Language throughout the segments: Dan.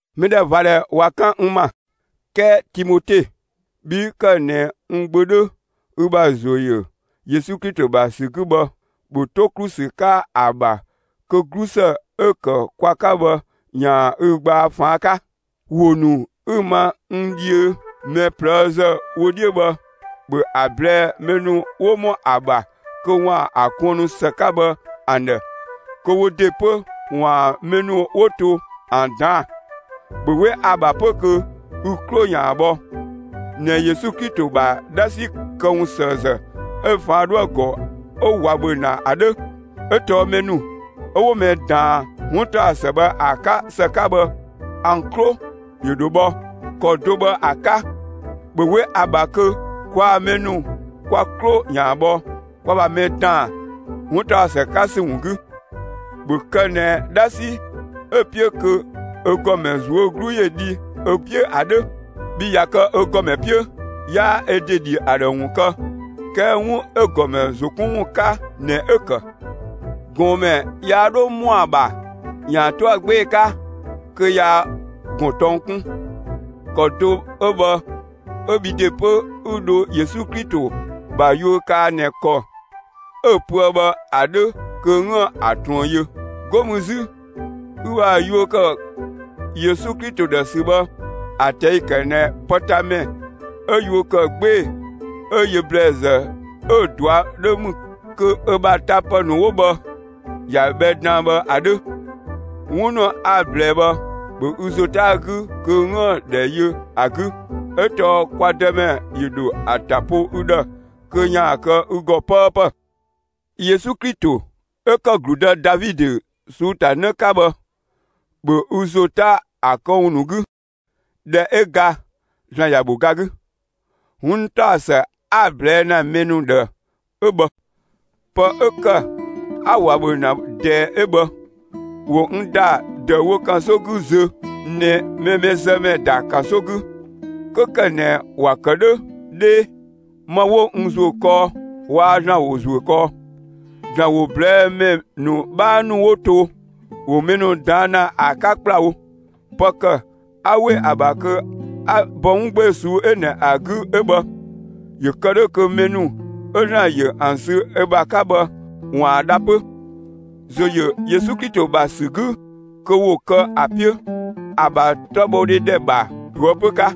(Mɛdhɛvadhɛ ꞊wa 'kan n ‑ma; 'kɛɛ) Timote, bhi 'ü ‑kë ꞊nɛ n gbö 'dhö ü ‑bha ‑zo ‑yö Yesu Klito ‑bha ‑sü 'gü bhë, ‑bhö 'to ‑klu ‑sü 'ka ‑a ‑bha kö 'glusë 'ö‑ ‑kë kwa 'ka bhë ‑yaan ü gbaa ꞊faan' 'ka! ‑Wo ‑nu 'ü‑ ma n dhiö mɛ ꞊plëëzë wö 'dhiö bhë, ‑bhö ‑a ꞊blɛɛ'‑ mɛ ‑nu 'wo ‑mɔ ‑a ‑bha kö ‑waan ‑a kuënnu ‑së 'ka bhë ‑an ‑dhë kö wo ‑de 'pö ‑waan mɛ ‑nu 'wo to ‑an ꞊daan'‑. ‑Bhö 'we ‑a ‑bha 'pö kö ü 'klo ‑yaan bhɔ ꞊nɛ Yesu Klito ‑bha 'dhasi këwunsëëzë 'ö ꞊faan' 'dhoë‑ ‑gɔ 'ö ꞊wa ‑bhö ‑na ‑a 'dhö! ('Ö tɔɔ mɛ ‑nu 'ö 'wo mɛ ꞊daan 'wuntaɔsë bhë ‑a 'ka ‑së 'ka bhë, ‑an 'klo ‑yö ‑dho bhɔ. ‑Kɔ do bhë ‑a 'ka, ‑bhö 'we ‑a ‑bha kö kwaa‑ mɛ ‑nu kwa 'klo ‑yaan bhɔ kwa ‑bha mɛ ‑daan 'wuntaɔsë 'ka ‑sü ‑wun 'gü.) ‑Bhö kë ꞊nɛ 'dhasi 'ö‑ 'piö kö ö ‑gɔmɛ ꞊zuö' 'glu ‑yö dhi ö 'piö ‑a 'dhö! Bhii ꞊ya kë ö ‑gɔmɛ 'piö, 'yaa ö ‑de ‑dhi ‑a ‑dhë ‑wun kë; 'kɛɛ 'wun 'ö‑ ‑gɔmɛ ‑zo 'kun ‑wun 'ka ꞊nɛ 'ö‑ ‑kë. ꞊Gɔɔnmɛ yaa 'dho ‑mɔa ‑bha ‑yaan 'to ‑a 'gbee‑ 'ka kö yaa ‑gɔn tɔng 'kun. (‑Kɔ do 'ö bhë 'ö bhi ‑de 'pö, 'ü dho Yesu Klito ‑bha yuö kaa ꞊nɛ ‑kɔ 'ö‑ pöë bhë ‑a 'dhö kö 'üën‑ ‑a ꞊truën yö!) 'Go mü 'zü ü ‑bha yuö kë Yesu Klito ‑dhë ‑sü bhë, ‑a ꞊tɛi'‑ ‑kë ꞊nɛ pëtamɛ 'ö yuö ‑kë 'gbee‑ 'ö yö ‑blɛɛzë 'ö‑ ꞊dua' 'dhö ‑mü kö ö ‑bha tapë ‑nu 'wo bhë, ‑ya bhɛ dan bhë ‑a 'dhö. 'Wun ‑nu 'a‑ ꞊blɛɛ bhë, ‑bhö ü ‑zo 'ta‑ 'gü kö 'üën‑ ‑dhɛ yö ‑a 'gü! 'Ö tɔɔ kwa Dëmɛ ‑yö ‑dho ‑a ‑ta po ü ‑dhë kö ‑yaan kë ü ‑gɔ 'pëëpë. Yesu Klito 'ö ‑kë ‑gludë Davidö ꞊suu'‑ ‑ta 'në 'ka bhë, ‑bhö ü ‑zo 'ta ‑a këwun ‑nu 'gü! ꞊Dhɛ 'ö ga ‑Zlan ‑ya ‑bho ga 'gü. 'Wuntaɔsë 'a‑ ꞊blɛɛ' ‑na mɛ ‑nu ‑dhë 'ö bhë. Pë 'ö ‑kë 'a ꞊wa ‑bhö ‑na ꞊dɛɛ 'ö bhë. ‑Wo n ‑da ‑dëüwo ‑kanso 'gü zö ꞊nɛ mɛ mɛzëmɛ ‑da ‑kanso 'gü. 'Kö ‑kë ꞊nɛ ‑wa ‑kë 'dhö 'dhee, ma 'wo n ‑zuö kɔɔ, waa ‑Zlan ‑wo ‑zuö kɔɔ; (‑Zlan ‑wo ꞊blɛɛ'‑ ‑mɛ ‑nu 'bhaa ‑nu 'wo to, ‑wo mɛ ‑nu ꞊daan' ‑na ‑a 'ka ‑kplawo). Pë ‑kë 'a ‑we ‑a ‑bha kö 'a bɔ 'wun 'gbee‑ ꞊suu'‑ 'ö ꞊nɛ ‑a 'gü 'ö bhë. ‑Yö kë 'dhö kö mɛ ‑nu 'ö ‑Zlan ‑yö ‑an sü ö ‑bha 'ka bhë, ‑waan dha 'pö, ‑zo ‑yö Yesu Klito ‑bha ‑sü 'gü kö ‑wo kë ‑a 'piö, ‑a ‑bha 'tɔbhɔdhe ‑dhɛ ‑bha ꞊toëpö 'ka.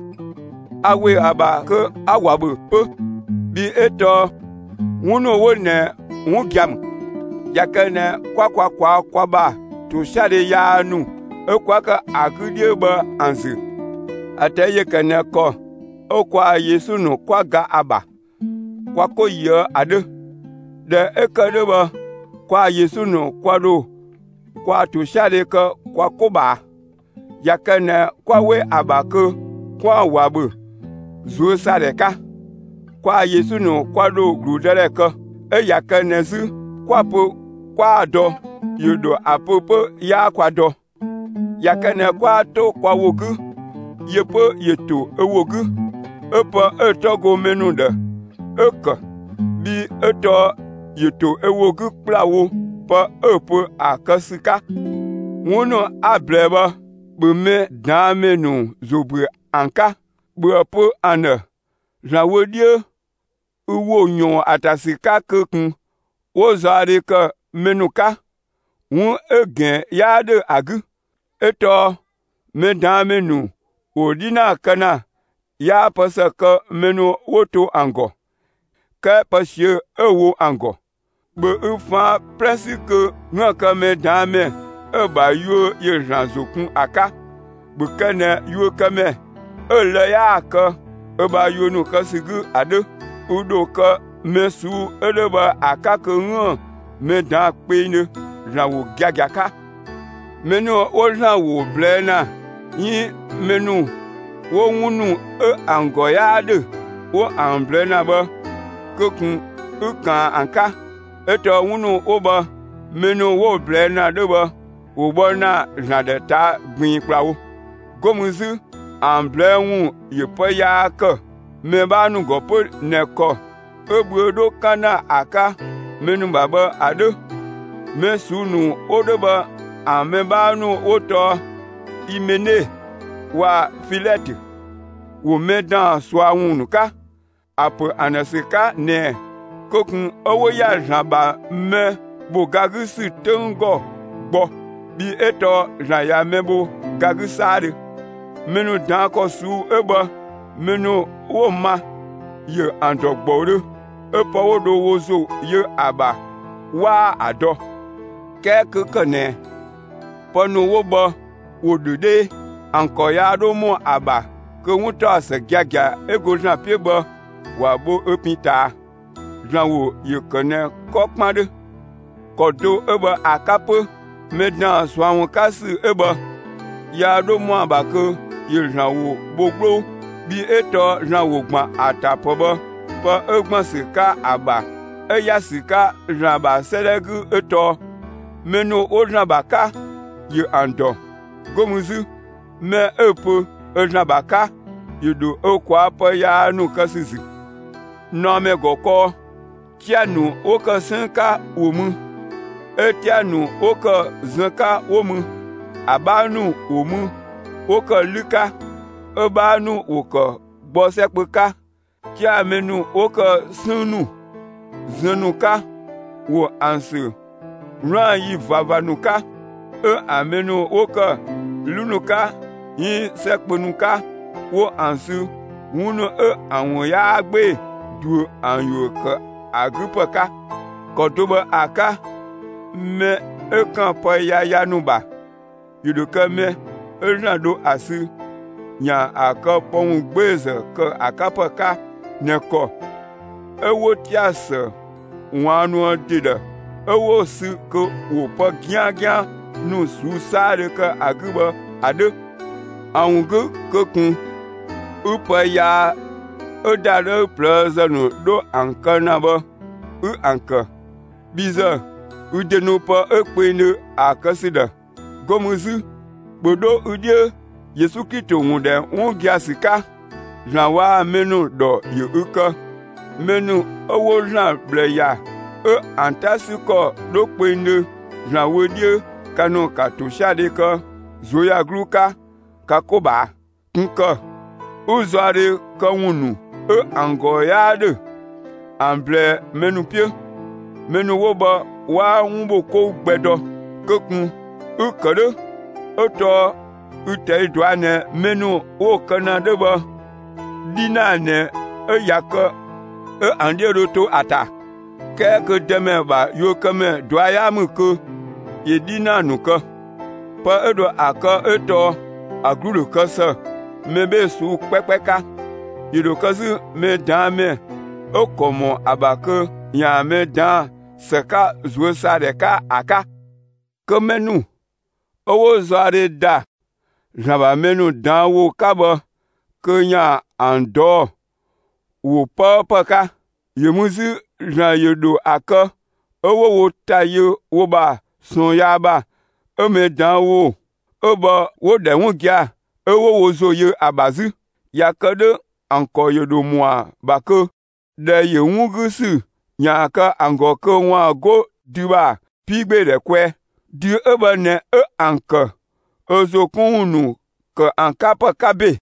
(A ‑we ‑a ‑bha kö 'a ꞊wa ‑bhö 'pö, bhii 'ö tɔɔ) 'wun ‑nu 'wo ꞊nɛ 'wun gia‑ ‑mü. ꞊Ya kë ꞊nɛ 'kwa kwa ꞊kwaa'‑ kwa ‑bha ‑tosiadhe yaa ‑nu 'ö 'kwa ‑kë ‑an 'gü 'dhiö bhë ‑an ‑zü, ‑a ꞊tɛi' ‑yö ‑kë ꞊nɛ ‑kɔ 'ö kwaa‑ Yesu ‑nu 'kwa ga ‑a ‑bha, kwa 'ko yöë ‑a 'dhö. ꞊Dhɛ 'ö ‑kë 'dhö bhë kwaa‑ Yesu ‑nu kwa ‑dho kwaa‑ ‑tosiadhe kë kwa 'ko ꞊bhaa. ꞊Ya kë ꞊nɛ 'kwa 'we ‑a ‑bha kö 'kwaan‑ ꞊wa ‑bhö ꞊zuösaadhɛ 'ka, kwaa‑ Yesu ‑nu kwa ‑dho ‑gludëdhɛ kë. 'Ö ꞊ya kë ꞊nɛ 'zü 'kwa‑ pö 'kwaa‑ dɔ, ‑yö ‑dho ‑a pö 'pö 'yaa kwa dɔ. ꞊Ya kë ꞊nɛ 'kwaa 'to kwa ‑wo 'gü, yö 'pö ‑yö ‑to ö ‑wo 'gü, 'ö pë 'ö‑ 'tɔ go mɛ ‑nu ‑dhë, 'ö‑ ‑kë, bhii 'ö tɔɔ ‑yö ‑to ö ‑wo 'gü ‑kplawo, pë 'ö‑ pö ‑a kë ‑sü 'ka. 'Wun ‑nu 'a‑ ꞊blɛɛ bhë, ‑bhö mɛ ꞊daan' ‑mɛ ‑nu ‑zo ‑büö ‑an 'ka! ‑Bhöë pö ‑an ‑dhë ‑Zlan wö 'dhiö, ü ‑wo ‑yɔɔn ‑a ‑ta ‑sü 'ka kö ꞊kun 'wo zaɔdhe ‑kë mɛ ‑nu 'ka, 'wun 'ö‑ ‑gɛn 'yaa 'dhö ‑a 'gü! 'Ö tɔɔ mɛ ꞊daan' ‑mɛ ‑nu ‑wo 'dhinaa kë ‑na, 'yaa pë ‑së kë mɛ ‑nu 'wo to ‑an ‑gɔ, 'kɛɛ pë ꞊siö'‑ 'ö‑ wo ‑an ‑gɔ. ‑Bhö ü ꞊faan' 'plɛ 'sü kö 'üën‑ kë mɛ ꞊daan' ‑mɛ 'ö‑ ‑bha yuö ‑yö ‑Zlan ‑zo kun ‑a 'ka! ‑Bhö kë ꞊nɛ yuökëmɛ, 'ö lë‑ 'yaa‑ kë ö ‑bha yuö ‑nu kë ‑sü 'gü ‑a 'dhö! Ü ‑dho kë mɛ ꞊suu'‑ 'ö 'dhö bhë ‑a 'ka kö 'üën‑ mɛ ꞊daan'‑ kpengdhö, ‑Zlan ‑wo giagia 'ka. Mɛ ‑nu 'wo ‑Zlan ‑wo yaa ꞊blɛɛ' ‑na 'iin mɛ ‑nu 'wo 'wun ‑nu 'ö ‑an ‑gɔ 'yaa 'dhö 'wo ‑an ꞊blɛɛ' ‑na bhë, kö ꞊kun 'ü ꞊kaan ‑an 'ka! 'Ö tɔɔ 'wun ‑nu 'wo bhë mɛ ‑nu 'wo‑ ꞊blɛɛ' ‑na 'dhö bhë, ‑wo bhɔ ‑na ‑Zlan ‑dhë ꞊taa' ꞊gbiin ‑kplawo. 'Go mü 'zü ‑an ꞊blɛɛ'‑ ‑wun ‑yö pë yaa ‑kë, mɛ 'bhaa ‑nu ‑gɔ 'pö ꞊nɛ ‑kɔ 'ö bhüö 'dho 'kan ‑na ‑a 'ka mɛ ‑nu ‑bha bhë ‑a 'dhö. Mɛ ꞊suu'‑ ‑nu 'wo 'dhö bhë ‑an mɛ 'bhaa ‑nu 'wo tɔɔ Imene waa‑ Filɛtö. ‑Wo mɛ ‑daan ꞊sua ‑wun ‑nu 'ka, ‑a ‑pö ‑an ‑dhë ‑sü 'ka ꞊nɛɛ kö ꞊kun 'ö 'wo ‑ya ‑Zlan ‑bha mɛ ‑bho ga 'gü ‑sü 'töng ‑gɔ gbɔ, bhii 'ö tɔɔ ‑Zlan ꞊ya mɛ bho ga 'gü 'saadhö. Mɛ ‑nu ꞊daan' ‑kɔ ꞊suu'‑ 'ö bhë, mɛ ‑nu 'wo‑ ma, ‑yö ‑an ‑dɔ ‑gbɔudhö, 'ö pë 'wo dho wo ‑zo yö ‑a ‑bha 'waa ‑a dɔ. 'Kɛɛ 'kö ‑kë ꞊nɛ pë ‑nu 'wo bhë ‑wo ‑dhö 'dhee, ‑an ‑kɔ yaa 'dho ‑mɔ ‑a ‑bha kö 'wuntaɔsë giagia 'ö go ‑Zlan 'piö bhë, ‑wa bho ö pin ‑ta. ‑Zlan ‑wo ‑yö ‑kë ꞊nɛ 'kɔ 'kpan 'dhö. ‑Kɔ do 'ö bhë ‑a 'ka 'pö, mɛ ‑daan ꞊sua ‑wun 'ka ‑sü 'ö bhë, yaa 'dho ‑mɔa ‑bha kö ‑yö ‑Zlan ‑wo bho 'gbloo. Bhii 'ö tɔɔ ‑Zlan ‑wo ‑gban ‑a ‑ta ‑pë bhë, pë 'ö ‑gban ‑sü 'ka ‑a ‑bha 'ö ‑ya ‑sü 'ka ‑Zlan ‑bha 'sëëdhɛ 'gü 'ö tɔɔ: Mɛ ‑nu 'wo ‑Zlan ‑bha 'ka, ‑yö ‑an ‑dɔ. 'Go mü 'zü: Mɛ 'ö‑ pö ö ‑Zlan ‑bha 'ka, ‑yö ‑dho ö ꞊kwaa'‑ pë yaa ‑nu kë ‑sü ‑zü. ꞊Naɔmɛ ‑gɔ kɔɔ, 'tia‑ ‑nu 'wo ‑kë 'sënng 'ka ‑wo mü, 'ö 'tia‑ ‑nu 'wo ‑kë zënng 'ka 'wo mü. ‑A 'bhaa ‑nu ‑wo mü 'wo ‑kë 'lü 'ka, 'ö‑ 'bhaa ‑nu ‑wo ‑kë gbɔ 'sɛ kpö 'ka. 'Tia‑ mɛ ‑nu 'wo ‑kë 'sënng ‑nu, zënng ‑nu 'ka, ‑wo ‑an ‑sü 'wlaan‑ ‑yi ꞊vava ‑nu 'ka. 'Ö ‑an mɛ ‑nu 'wo ‑kë 'lü ‑nu 'ka 'iin 'sɛ kpö ‑nu 'ka, 'wo ‑an sü 'wun ‑nu 'ö ‑an ‑wun 'yaa 'gbee‑ ꞊duö ‑an ‑yuö ‑kë ‑a 'gü ‑pë 'ka. ‑Kɔ do bhë ‑a 'ka, mɛ 'ö ‑kan pë yaya ‑nu ‑bha, ‑yö ‑dho kë mɛ 'ö ‑Zlan dho ‑a sü ‑yaan ‑a kë pë ‑wun 'gbeezë ‑kë ‑a 'ka ‑pë 'ka ꞊nɛ ‑kɔ 'ö 'wo 'tia‑ ‑së ꞊waannuë ‑de ‑dhë, 'ö 'wo‑ sü kö ‑wo pë 'giangian ‑nu ꞊suu'‑ 'saadhö kë ‑a 'gü bhë ‑a 'dhö. ‑A ‑wun 'gü kö ꞊kun 'ü pë yaa 'ö ‑dadhëü ꞊plëëzë ‑nu 'dho ‑an kë ‑na bhë, 'ü ‑an kë! Bhi ‑zë, ü ‑de nu pë 'ö kpengdhö ‑a kë ‑sü ‑dhë! 'Go mü 'zü, ‑bhö 'dho ü 'dhiö Yesu Klito ‑wun ‑dhɛ 'wun gia‑ ‑sü 'ka! ‑Zlan waa‑ mɛ ‑nu ‑dhɔ ‑yö ü ‑kë! Mɛ ‑nu 'ö 'wo ‑Zlan ꞊bhlë ‑ya 'ö ‑an 'ta 'sü ‑kɔ 'dho kpengdhö ‑Zlan wö 'dhiö, ka ‑nu ‑ka ‑tosiadhe kë ꞊zuöyagluu 'ka ka 'ko ꞊bhaa! ꞊Kun ‑kë 'ü zaɔdhe këwun ‑nu 'ö ‑an ‑gɔ 'yaa ‑dhö ‑an ꞊blɛɛ'‑ ‑mɛ ‑nu 'piö! Mɛ ‑nu 'wo bhë, 'waa 'wun ‑bho 'kou gbɛ dɔ. Kö ꞊kun 'ü‑ ‑kë 'dhö 'ö tɔɔ ü‑ ꞊tɛi' ꞊dɔa' ꞊nɛ mɛ ‑nu 'wo‑ kë ‑na 'dhö bhë, 'dhinaa ꞊nɛ 'ö ꞊ya kë 'ö ‑an 'dhiö dho to ‑a ‑ta. 'Kɛɛ kö Dëmɛ ‑bha yuökëmɛ ꞊dua' 'yaa ‑mü kö ‑yö 'dhinaa ‑nu kë. Pë 'ö dho ‑a kë 'ö tɔɔ ‑a 'glu ‑dho kë ‑së mɛ 'bhee‑ ꞊suu'‑ 'kpɛkpɛ 'ka! ‑Yö ‑dho kë 'zü, mɛ ꞊daan' ‑mɛ 'ö‑ ‑kɔ ‑mɔ ‑a ‑bha kö ‑yaan mɛ ꞊daan' ‑së 'ka ꞊zuösaadhɛ 'ka ‑a 'ka! Kö mɛ ‑nu 'ö 'wo zaɔdhe ‑da ‑Zlan ‑bha mɛ ꞊daan' ‑wo 'ka bhë kö ‑yaan ‑an ꞊dɔɔ'‑ ‑wo 'pëëpë 'ka. ‑Yö mü 'zü ‑Zlan ‑yö ‑dho ‑a kë 'ö 'wo wo ‑ta yö wo ‑bha ꞊sɔɔn yaa ‑bha 'ö mɛ ꞊daan' ‑wo 'ö bhë, 'wo‑ ‑dhɛ 'wun gia‑ 'ö 'wo wo ‑zo yö ‑a ‑bha 'zü. ꞊Ya kë 'dhö ‑an ‑kɔ ‑yö ‑dho ‑mɔa ‑bha kö ‑dhɛ ‑yö 'wun 'gü ‑sü ‑yaan kë ‑an ‑gɔ kö ‑waan 'go dü ‑bha 'piigbeedhɛ kwɛɛ. Dü 'ö bhë ꞊nɛ 'ö ‑an kë ö ‑zo 'kun ‑wun ‑nu ‑kë ‑an 'ka ‑pë 'ka ‑be.